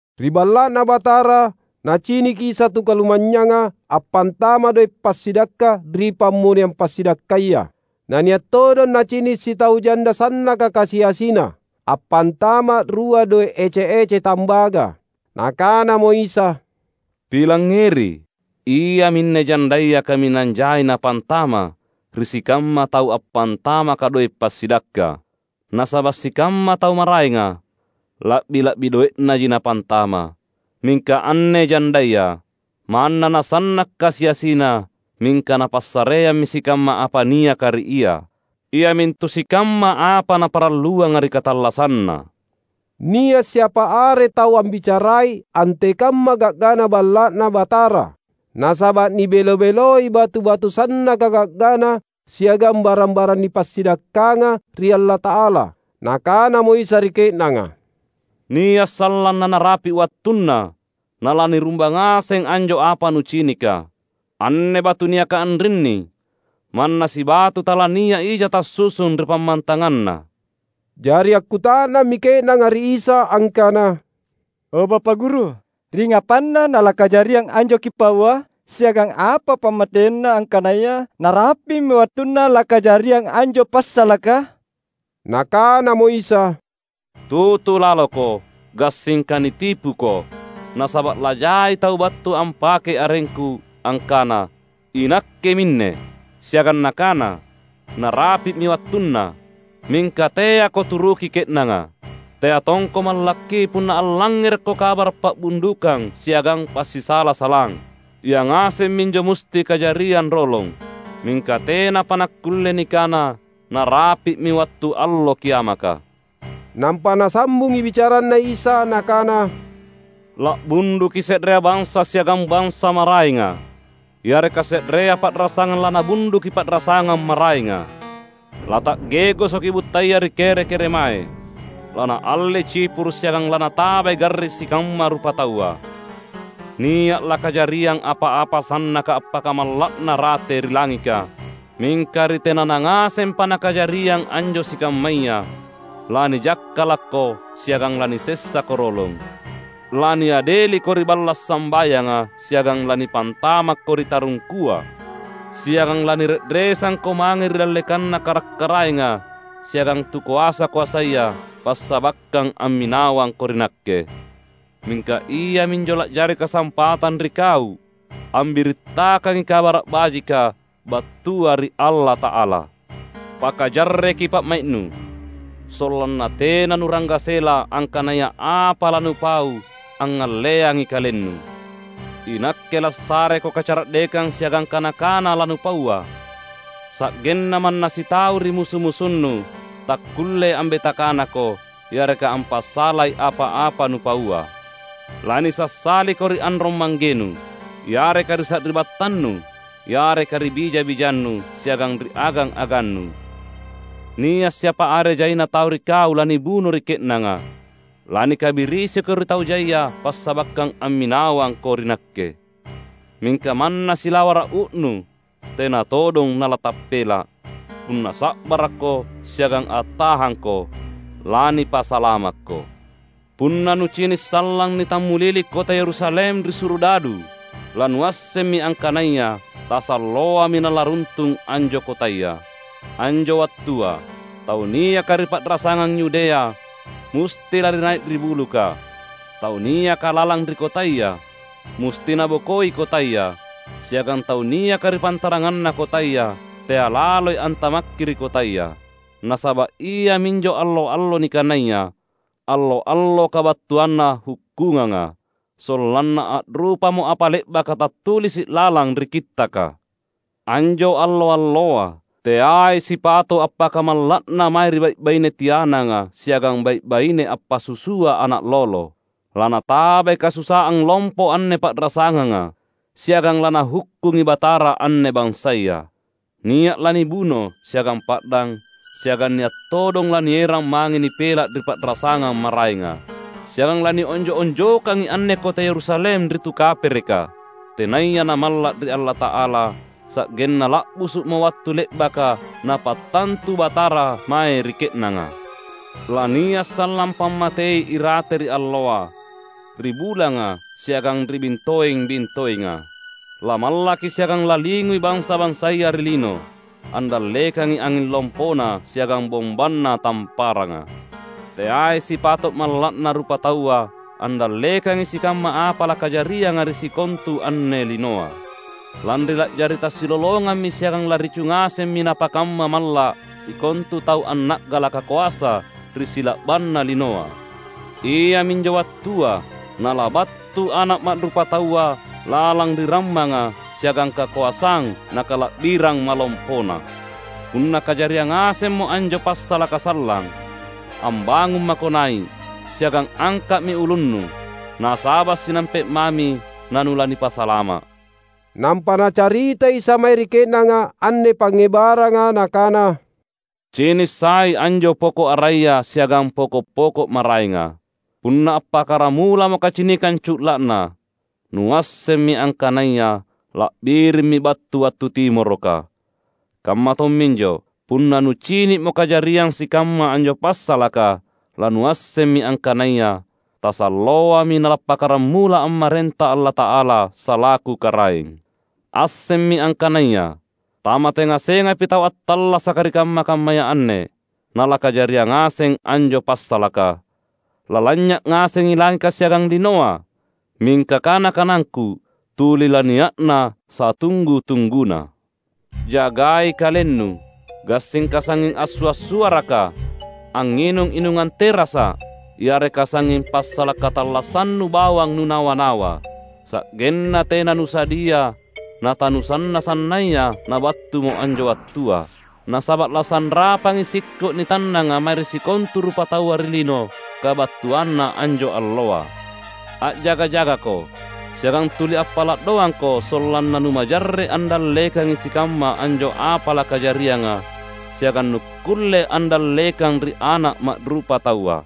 Ri Balla’Na Batara, Naciniki Isa tu kalumanynyanga appantama’ doe’ passidakka ri pammoneang passidakkaya. Na nia’ todong nacini’ sitau janda sannaka kasi-asina, appantama’ rua doe’ ece-ece tambaga. Nakanamo Isa, "Pilangngeri: iaminne jandaya kaminang jai napantama’ ri sikamma tau appantamaka doe’ passidakka. Nasaba’ sikamma tau maraenga, la’bi-la’bi doe’naji napantama’. Mingka anne jandaya, manna nasanna’ kasi-asina, mingka napassareammi sikamma apa niaka ri ia, iamintu sikamma apa naparalluanga ri katallasanna." Nia’ siapa are tau ambicarai antekamma ga’gana Balla’Na Batara. Nasaba’ nibelo-beloi batu-batu sannaka ga’gana siagang barang-barang nipassidakkanga ri Allata’ala. Nakanamo Isa ri ke’nanga, "Nia’ sallang nanarapi’ wattunna nalanirumbang ngaseng anjo apa nucinika; anne batu niaka anrinni manna sibatu talania’ija tassusung ri pammantanganna!" Jari akkuta’nammi ke’nanga ri Isa angkana, "O, Bapa’ Guru, ringngapanna nalakajariang anjo Kipaua? Siagang apa pammateina angkanaya narapi’mi wattunna lakajariang anjo passalaka?" Nakanamo Isa, "Tutu laloko, gassingka nitipuko. Nasaba’ lajai tau battu ampakei arengKu, angkana, ‘Inakke minne!’ Siagang nakana, ‘Narapi’mi wattunna.’ Mingka teako turuki ke’nanga. Tea tongko mallakki punna allangngerekko kabara’ pa’bundukang siagang passisala-salang. Ia ngaseng minjo musti kajariang rolong. Mingka tenapa nakkulle nikana narapi’mi wattu allo kiamaka." Nampa Nasambungi bicaranNa Isa Nakana, "La’bunduki se’rea bansa siagang bansa maraenga, yareka se’rea pa’rasangang lanabunduki pa’rasangang maraenga. Lata’ge’gosoki buttaya ri kere-keremae. Lanaallei cipuru’ siagang lanatabai garring sikamma rupataua. Nia’ lakajariang apa-apa sannaka appakamalla’na rate ri langika. Mingka ri tenana ngasempa nakajariang anjo sikammaya, lanijakkalakko siagang lanisessako rolong. Laniadeliko ri balla’ sambayanga siagang lanipantamakko ri tarungkua. Siagang lanire’resangko mange ri dallekanna karak-karaenga siagang tu koasa-koasaya, passabakkang amminawangko ri Nakke. Mingka iaminjo la’jari kasampatang ri kau ambirittakangi Kabara’ Bajika, battua ri Allata’ala. Pakajarreki pa’mai’nu, sollanna tena nularanggasela angkanaya apa lanupau angngalleangi kalennu. INakke lassareko kacara’dekang siagang kana-kana lanupaua. Sa’genna manna sitau ri musu-musunnu takkulle ambeta kanako yareka ampassalai apa-apa nupaua. Lanisassaliko ri anrong-manggenu, yareka ri sari’battannu, yareka ri bija-bijannu, siagang ri agang-agannu. Nia’ siapa are jaina tau ri kau lanibuno ri ke’nanga. Lanikabirisiko ri tau jaia passabakkang amminawangko ri Nakke. Mingka manna silawara’ uu’nu tena todong nalatappela’. Punna sa’barakko siagang attahangko, lanipasalamakko." "Punna nucini’ sallang nitammulili kota Yerusalem ri surudadu, lanuassemmi angkanaya tasalloami nalaruntung anjo kotaya. Anjo wattua, tau niaka ri pa’rasangang Yudea musti lari nai’ ri buluka. Tau niaka lalang ri kotaya musti nabokoi kotaya, siagang tau niaka ri pantaranganna kotaya tea’ laloi antamakki ri kotaya. Nasaba’ iaminjo allo-allo nikanaya, ‘Allo-allo Kabattuanna Hukkunganga,’ sollanna a’rupamo apa le’baka tattulisi’ lalang ri Kittaka. Anjo allo-alloa teai sipato’ appakamalla’na mae ri bai’-baine tiananga siagang bai’-baine appasusua ana’ lolo! Lanatabai kasusaang lompo anne pa’rasanganga, siagang laNahukkungi Batara anne bansaya. Nia’ lanibuno siagang pa’dang, siagang nia’ todong lanierang mange nipela’ ri pa’rasangang maraenga. Siagang lanionjo’-onjokangi anne kota Yerusalem ri tu kapereka, tenaya namalla’ ri Allata’ala, sa’genna la’busu’mo wattu le’baka Napattantu Batara mae ri ke’nanga." "Lania’ sallang pammatei irate ri alloa, ri bulanga, siagang ri bintoeng-bintoenga. Lamallaki siagang lalingui bansa-bansaya ri lino, andallekangi anging lompona siagang bombanna tamparanga. Teai sipato’ malla’na rupataua andallekangi sikamma apa lakajarianga ri sikontu anne linoa, lanri la’jari tasilolongammi siagang laricu ngasemmi napakamma malla’ sikontu tau anna’galaka koasa ri sila’banna linoa. Iaminjo wattua Nalabattu Ana’ Ma’rupataua lalang ri rammanga siagang kakoasang na kala’birang malompoNa. Punna kajariang ngasemmo anjo passalaka sallang, ambangung mako nai’, siagang angka’mi ulunnu, nasaba’ sinampe’ mami nanulanipasalama’." Nampa Nacarita Isa mae ri ke’nanga anne pangngebaranga Nakana, "Cini’ sai anjo poko’ araya siagang poko’-poko’ maraenga. Punna appakkaramulamo kacinikang cu’la’na, nuassemmi angkanaya la’birimmi battu wattu timoroka. Kamma tomminjo, punna nucini’mo kajariang sikamma anjo passalaka, lanuassemmi angkanaya tasalloami nalappakkaramula ammarenta Allata’ala salaku Karaeng. Assemmi angkanaya, tamate ngasengapi tau attallasaka ri kamma-kammaya anne, nalakajariang ngaseng anjo passalaka. Lalanynya’ ngasengi langika siagang linoa, mingka kana-kanangKu tuli lania’na satunggu-tungguna." "Jagai kalennu, gassingka sangnging assua’-suaraka, angnginung inungang terasa’, yareka sangnging passala’ katallassannu bawang nunawa-nawa, sa’genna tena nusadia natanusanna-sannaya nabattumo anjo wattua. Nasaba’ lasanrapangi sikko’ nitannanga mae ri sikontu rupataua ri lino, kabattuanna anjo alloa. A’jaga-jagako, siagang tuli appala’ doangko sollanna numajarre’ andallekangi sikamma anjo apa lakajarianga, siagang nukkulle andallekang ri Ana’ Ma’rupataua."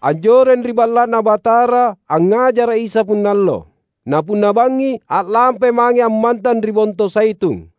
Anjoreng ri Balla’Na Batara angngajara’ Isa punna allo. Na punna bangngi a’lampai mange ammantang ri Bonto Zaitun.